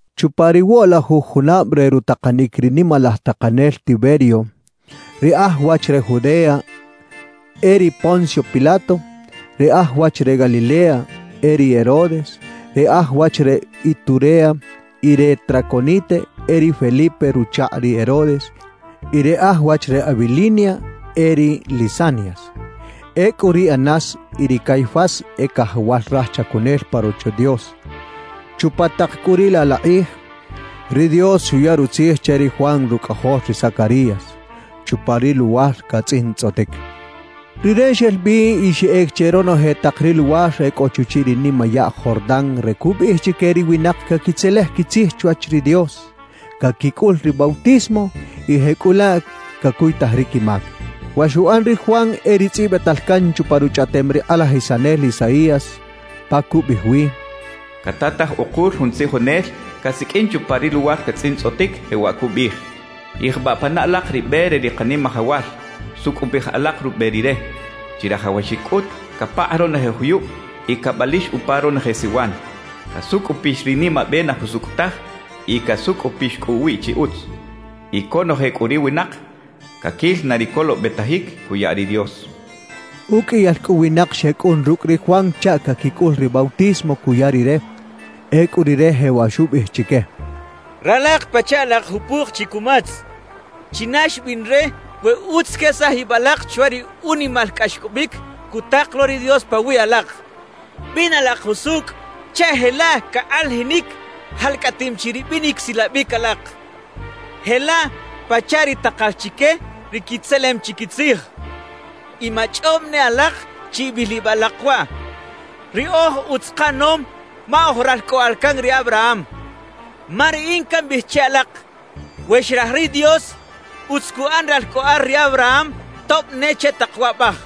Chupa ri woꞌlajuj junab re rutakanic ri nimalaj takanel Tiberio, ri aj wach re Judea e ri Poncio Pilato, ri aj wach re Galilea e ri Herodes, ri aj wach re Iturea y re Traconite e ri Felipe ruchakꞌ ri Herodes, y ri aj wach re Abilinia e ri Lisanias. Ecꞌu ri Anás y ri Caifás e cajawal raj chacunel pa Rocho Dios. Chupa tak cꞌu riꞌ laꞌ la kꞌij, ri Dios xuya rutzij che ri Juan rucꞌajol ri Zacarías, chupa ri luwar catzꞌintzꞌotic. Rire xel bi y xeꞌec che ronoje tak ri luwar e cꞌo chuchiꞌ ri nimayaꞌ Jordán re cubiꞌij chique ri winak caquitzelej quitzij chwach ri Dios, caquicꞌul ri bautismo, y jecꞌulaꞌ cacuytaj ri quimac. Wa xuꞌan ri Juan e ri tzꞌibital can chupa ruchꞌaꞌtem ri kꞌalajisanel Isaías, pa cubiꞌij wi: Catataj ukul jun tzijonel casiqꞌuin chupa ri luwar catzꞌintzꞌotic, jewaꞌ cubiꞌij: “Yijbaꞌ pana alak ri be re ri Kanimajawal; sucꞌupij alak rube Rire. Chirajawaxic cꞌut capakꞌ ronoje juyub y cabalix upa ronoje siwan; casucꞌupix ri nimabe na jusucꞌ taj y casucꞌupix cꞌu uwiꞌ chi utz. Y conoje cꞌu ri winak caquil na ri colobetajic cuya ri Dios” cachaꞌ. Uqꞌuiyal cꞌu winak xecꞌun rucꞌ ri Juan chaꞌ caquicꞌul ri bautismo cuya rire. Ecꞌu rire jewaꞌ xubiꞌij chique: —¡Ralak pachaꞌ alak jupuk chi cumatz! ¿China xbiꞌn re we utz quesaj ib alak chwach ri unimal cꞌaxcꞌobic cutak lo ri Dios pawiꞌ alak? Bina alak jusucꞌ chaꞌ jelaꞌ cakꞌalajinic jalcꞌatim chi ri binic silabic alak, jelaꞌ pachaꞌ ri takal chique ri quitzelem chi quitzij. Y machꞌob ne alak chi ibil ib alak waꞌ: “Riꞌoj utz kaꞌanom ma oj ralcꞌoꞌal can ri Abraham.” Ma riꞌin cambiꞌij che alak, we xraj ri Dios, utz cuꞌan ralcꞌoꞌal ri Abraham tob ne che tak waꞌbaj.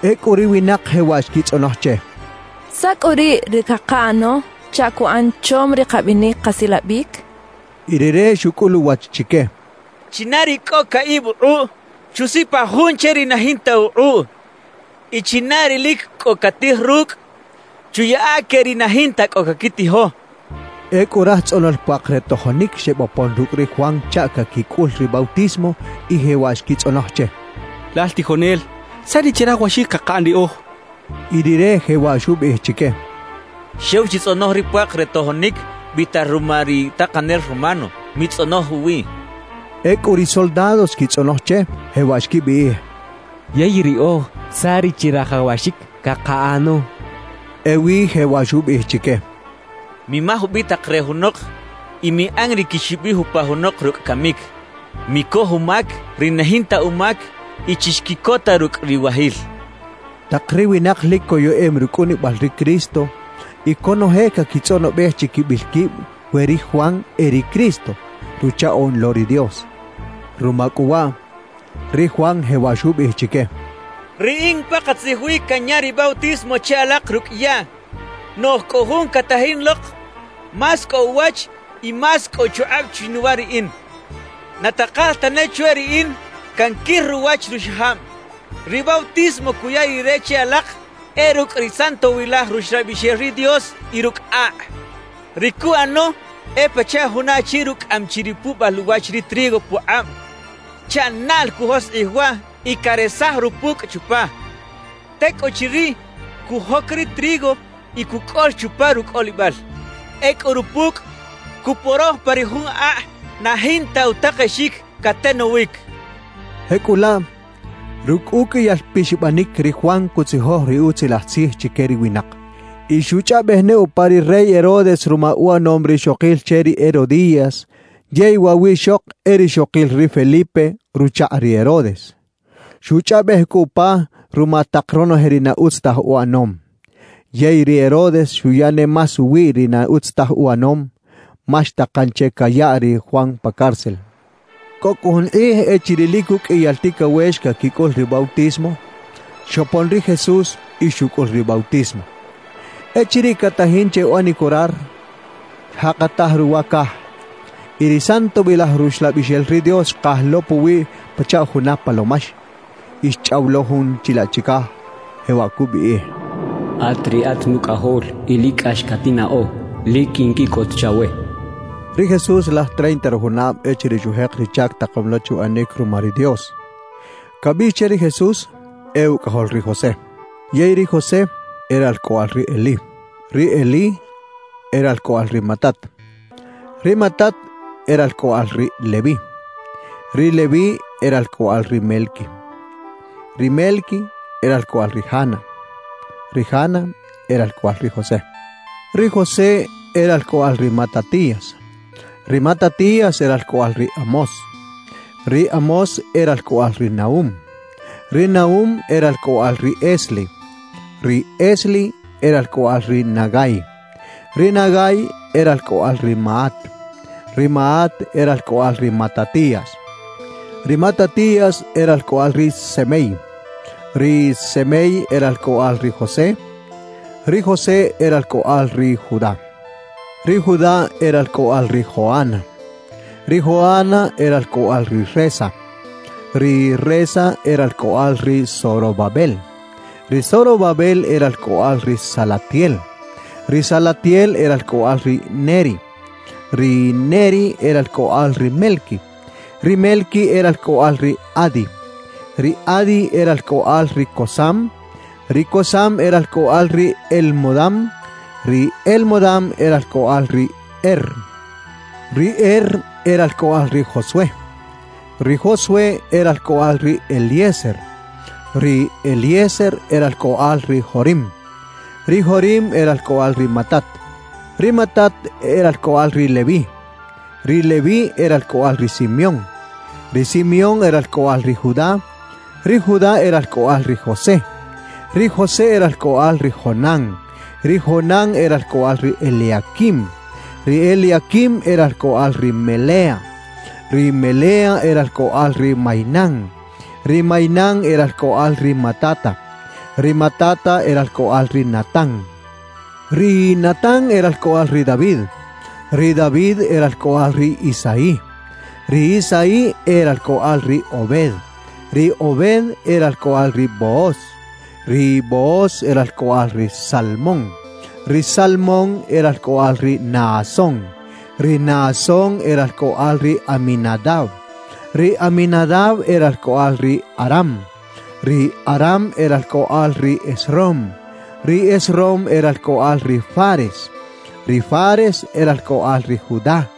Ecꞌu ri winak jewaꞌ xquitzꞌonoj che: —¿Saꞌ cꞌu riꞌ ri cakaꞌano chaꞌ cuꞌan chom ri kabinic kasilabic? —xechaꞌ. Y rire xucꞌul uwach chique: —China ri cꞌo caꞌib ukꞌuꞌ, chusipaj jun che ri na jinta ukꞌuꞌ; y china ri lic cꞌo catij rucꞌ, chuyaꞌa que ri na jinta cꞌo caquitijo —xcha chique. Ecꞌu raj tzꞌonol puak re tojonic xebopon rucꞌ ri Juan chaꞌ caquicꞌul ri bautismo y jewaꞌ xquitzꞌonoj che: —Lal tijonel, ¿saꞌ ri chirajawaxic cakaꞌan riꞌoj? —xechaꞌ. Y rire jewaꞌ xubiꞌij chique: —Xew chitzꞌonoj ri puak re tojonic biꞌtal ruma ri takanel romano; mitzꞌonoj uwiꞌ —xchaꞌ. Ecꞌu ri soldados xquitzꞌonoj che, jewaꞌ xquibiꞌij: —Yey riꞌoj, ¿saꞌ ri chirajawaxic cakaꞌano? —xechaꞌ. Ewi jewaꞌ xubiꞌij chique: —Mimaj ubitak re junok y miꞌan ri quixibij upa junok rucꞌ camic. Micoj umac ri na jinta umac y chixquiꞌcota rucꞌ riwajil —xchaꞌ. Tak ri winak lic coyeꞌem rucꞌunibal ri Cristo y conoje caquitzꞌonobej chiquibil quib we ri Juan e ri Cristo, Ruchaꞌoꞌn lo ri Dios. Ruma cꞌu waꞌ, ri Juan jewaꞌ xubiꞌij chique: —Riꞌin pakatzij wi canya ri bautismo che alak rucꞌ yaꞌ; noꞌj cꞌo Jun catajin lok más cꞌo uwach y más cꞌo uchukꞌab chinuwa riꞌin. Na takal tane chwe riꞌin canquir ruwach ruxajab. Ri bautismo cuya Rire che alak, e rucꞌ ri Santowilaj Ruxlabixel ri Dios y rucꞌ akꞌ. Ri cuꞌano e pachaꞌ juna achi rucꞌaꞌam chi ri puꞌbal uwach ri trigo pukꞌab chaꞌ naꞌl cujoskꞌij waꞌ y caresaj rupucꞌ chupa. Tecꞌuchiriꞌ, cujoc ri trigo y cucꞌol chupa rucꞌolibal. Ecꞌu rupucꞌ cuporoj pa ri jun akꞌ na jinta utakexic catenowic —xchaꞌ. Jecꞌulaꞌ, rucꞌ uqꞌuiyal pixabanic ri Juan cutzijoj ri Utzilaj Tzij chique ri winak. Y xuchꞌaꞌbej ne upa ri rey Herodes ruma uꞌanom rixokil che ri Herodías yey waꞌ wiꞌxok e rixokil ri Felipe ruchakꞌ ri Herodes. Xuchꞌaꞌbej cꞌu upa ruma tak ronoje ri na utz taj uꞌanom. Yey ri Herodes xuya ne más uwiꞌ ri na utz taj uꞌanom, ma xtakan che cayaꞌ ri Juan pa cárcel. Cꞌo cꞌu jun kꞌij echiriꞌ lic uqꞌuiyal ticawex caquicꞌul ri bautismo, xopon ri Jesús y xucꞌul ri bautismo. Echiriꞌ catajin che uꞌanic orar, xjakataj ruwa caj y ri Santowilaj Ruxlabixel ri Dios xkaj lo puwiꞌ pachaꞌ juna palomax. Y xchꞌaw lo Jun chilaꞌ chicaj, jewaꞌ cubiꞌij: «At riꞌat Nucꞌajol, y lic cꞌax catinnaꞌo. Lic quinquiꞌcot chawe» xcha che. Ri Jesús laj treinta rujunab echiriꞌ xujek ri chac takom lo che uꞌanic ruma ri Dios. Cabiꞌx che ri Jesús, e ucꞌajol ri José. Yey ri José, e ralcꞌoꞌal ri Elí. Ri Elí e ralcꞌoꞌal ri Matat; ri Matat e ralcꞌoꞌal ri Leví; ri Leví e ralcꞌoꞌal ri Melqui; ri Melqui e ralcꞌoꞌal ri Jana; ri Jana e ralcꞌoꞌal ri José; ri José e ralcꞌoꞌal ri Matatías; ri Matatías e ralcꞌoꞌal ri Amós; ri Amós e ralcꞌoꞌal ri Nahum; ri Nahum e ralcꞌoꞌal ri Esli; ri Esli e ralcꞌoꞌal ri Nagai; ri Nagai e ralcꞌoꞌal ri Maat; ri Maat e ralcꞌoꞌal ri Matatías; ri Matatías e ralcꞌoꞌal ri Semei; ri Semei e ralcꞌoꞌal ri José; ri José e ralcꞌoꞌal ri Judá; ri Judá e ralcꞌoꞌal ri Joana; ri Joana e ralcꞌoꞌal ri Resa; ri Resa e ralcꞌoꞌal ri Zorobabel; ri Zorobabel e ralcꞌoꞌal ri Salatiel; ri Salatiel e ralcꞌoꞌal ri Neri; ri Neri e ralcꞌoꞌal ri Melqui; ri Melqui e ralcꞌoꞌal ri Adi; ri Adi e ralcꞌoꞌal ri Cosam; ri Cosam e ralcꞌoꞌal ri Elmodam; ri Elmodam e ralcꞌoꞌal ri Er; ri Er e ralcꞌoꞌal ri Josué; ri Josué e ralcꞌoꞌal ri Eliezer; ri Eliezer e ralcꞌoꞌal ri Jorim; ri Jorim e ralcꞌoꞌal ri Matat; ri Matat e ralcꞌoꞌal ri Leví; ri Leví e ralcꞌoꞌal ri Simeón; ri Simeón e ralcꞌoꞌal ri Judá; ri Judá e ralcꞌoꞌal ri José; ri José e ralcꞌoꞌal ri Jonán; ri Jonán e ralcꞌoꞌal ri Eliaquim; ri Eliaquim e ralcꞌoꞌal ri Melea; ri Melea e ralcꞌoꞌal ri Mainán; ri Mainán e ralcꞌoꞌal ri Matata; ri Matata e ralcꞌoꞌal ri Natán; ri Natán e ralcꞌoꞌal ri David; ri David e ralcꞌoꞌal ri Isaí; ri Isaí e ralcꞌoꞌal ri Obed; ri Obed e ralcꞌoꞌal ri Booz; ri Booz e ralcꞌoꞌal ri Salmón; ri Salmón e ralcꞌoꞌal ri Naasón; ri Naasón e ralcꞌoꞌal ri Aminadab; ri Aminadab e ralcꞌoꞌal ri Aram; ri Aram e ralcꞌoꞌal ri Esrom; ri Esrom e ralcꞌoꞌal ri Fares; ri Fares e ralcꞌoꞌal ri Judá;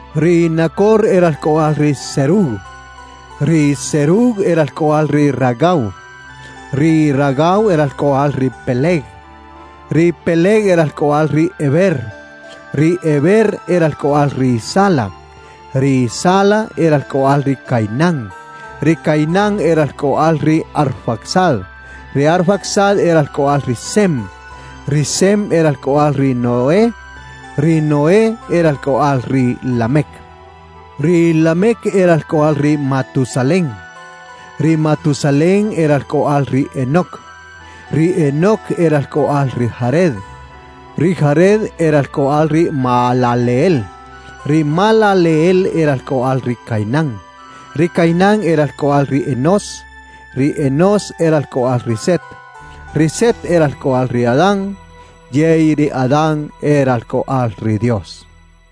ri Nacor e ralcꞌoꞌal ri Serug; ri Serug e ralcꞌoꞌal ri Ragau; ri Ragau e ralcꞌoꞌal ri Peleg; ri Peleg e ralcꞌoꞌal ri Heber; ri Heber e ralcꞌoꞌal ri Sala; ri Sala e ralcꞌoꞌal ri Cainán; ri Cainán e ralcꞌoꞌal ri Arfaxad; ri Arfaxad e ralcꞌoꞌal ri Sem; ri Sem e ralcꞌoꞌal ri Noé; ri Noé e ralcꞌoꞌal ri Lamec; ri Lamec e ralcꞌoꞌal ri Matusalén; ri Matusalén e ralcꞌoꞌal ri Enoc; ri Enoc e ralcꞌoꞌal ri Jared; ri Jared e ralcꞌoꞌal ri Mahalaleel; ri Mahalaleel e ralcꞌoꞌal ri Cainán; ri Cainán e ralcꞌoꞌal ri Enós; ri Enós e ralcꞌoꞌal ri Set; ri Set e ralcꞌoꞌal ri Adán; yey ri Adán e ralcꞌoꞌal ri Dios.